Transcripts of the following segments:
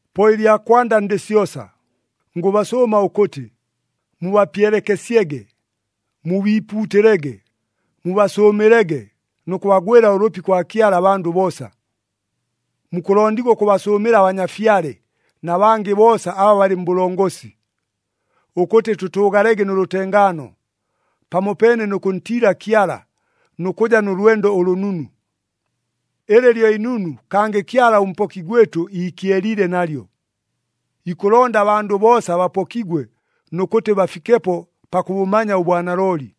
Po ɨlya kwanda ndɨ syosa, ngʉbasʉʉma ʉkʉtɨ, mubapyelekesyege, mubiipuutɨlege, mubasʉʉmɨlege nʉ kʉbagwɨla ʉlʉpi kwa Kyala abandʉ boosa. Mukʉlondigwa ʉkʉbasʉʉmɨla abanyafyale na bangɨ boosa aba balɨ mbʉlongosi, ʉkʉtɨ tʉtʉʉgalege nʉ lʉtengaano, pamopeene nʉ kʉntiila Kyala nʉ kʉja nʉ lwendo ʉlʉnunu. Ɨlɨ lyo inunu, kangɨ Kyala ʉMpoki gwɨtʉ iikyeliile nalyo. Ikʉlonda abandʉ boosa bapokigwe nʉ kʉtɨ bafikepo pakʉbʉmanya ʉbwanalooli.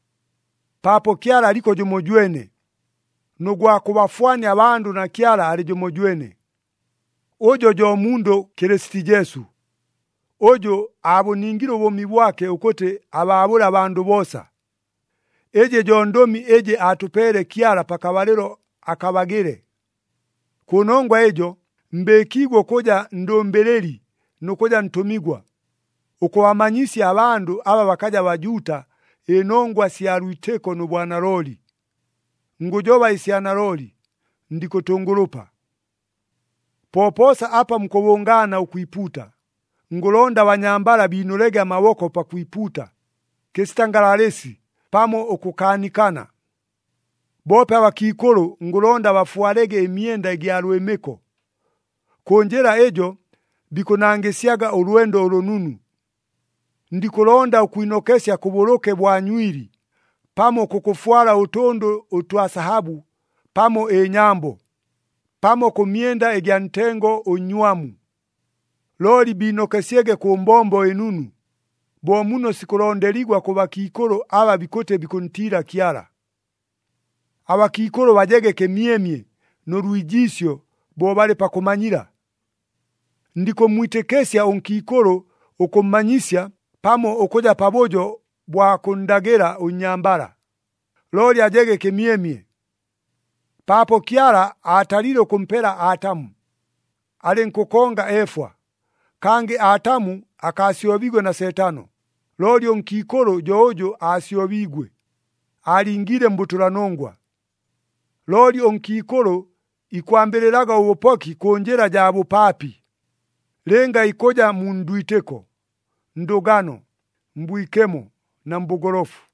Paapo Kyala aliko jʉmojwene, nʉ gwa kʉbafwania abandʉ na Kyala alɨ jʉmojwene. Ʉjo jo mundʉ Kɨlɨsiti Jesu, ʉjʉ aabʉningile ʉbʉʉmi bwake ʉkʉtɨ abaabʉle abandʉ boosa. Ɨjɨ jo ndʉmi ɨjɨ aatʉpeele Kyala pakabalɨlo akabagɨle. Kʉnongwa ɨjo mbɨɨkiigwe ʉkʉja ndʉmbɨlɨli nʉ kʉja ntʉmigwa, ʉkʉbamanyisya abandʉ aba bakaja Bajuuta ɨnongwa sya lwitɨko nʉ bwanalooli. Ngʉjoba ɨsya nalooli, ndikʉtʉngʉlʉpa. Popoosa apa mukʉbʉngaana ʉkwipuuta, ngʉlonda abanyambala biinʉlege amaboko pakwipuuta, kɨsita ngalalɨsi pamo ʉkʉkaanikana. Boope abakiikʉlʉ ngʉlonda bafwalege ɨmyenda ɨgya lwɨmɨko. Kʉ njɨla ɨjo bikʉnangɨsyaga ʉlwendo ʉlʉnunu. Ndikʉlonda ʉkwinokesya kʉbʉlʉke bwa nywili, pamo kʉkʉfwala ʉtʉndʉ ʉtwa sahabʉ pamo ɨnyambo, pamo kʉ myenda ɨgya ntengo ʉnnywamu. Looli biinokesyege kʉ mbombo ɨnunu, bo muno sikʉlondeligwa kʉ bakiikʉlʉ aba bikʉtɨ bikʉntiila Kyala. Abakiikʉlʉ bajege kɨmyemye nʉ lwijiisyo bo balɨ pakʉmanyila. Ndikʉmmwitɨkɨsya ʉnkiikʉlʉ ʉkʉmmanyisya pamo ʉkʉja pabʉjo bwa kʉnndagɨla ʉnnyambala, looli ajege kɨmyemye. Paapo Kyala aatalile ʉkʉmpela Atamu, alɨnkʉkonga Efwa. Kangɨ Atamu akaasyobiigwe na Seetano, looli ʉnkiikʉlʉ jo ʉjʉ aasyobiigwe, aalingiile mbʉtʉlanongwa. Looli ʉnkiikʉlʉ ikwambɨlɨlaga ʉbʉpoki kʉ njɨla jaa bʉpaapi, lɨnga ikʉja mu ndwitɨko, ndʉgano, mbwikemo na mbʉgolofu.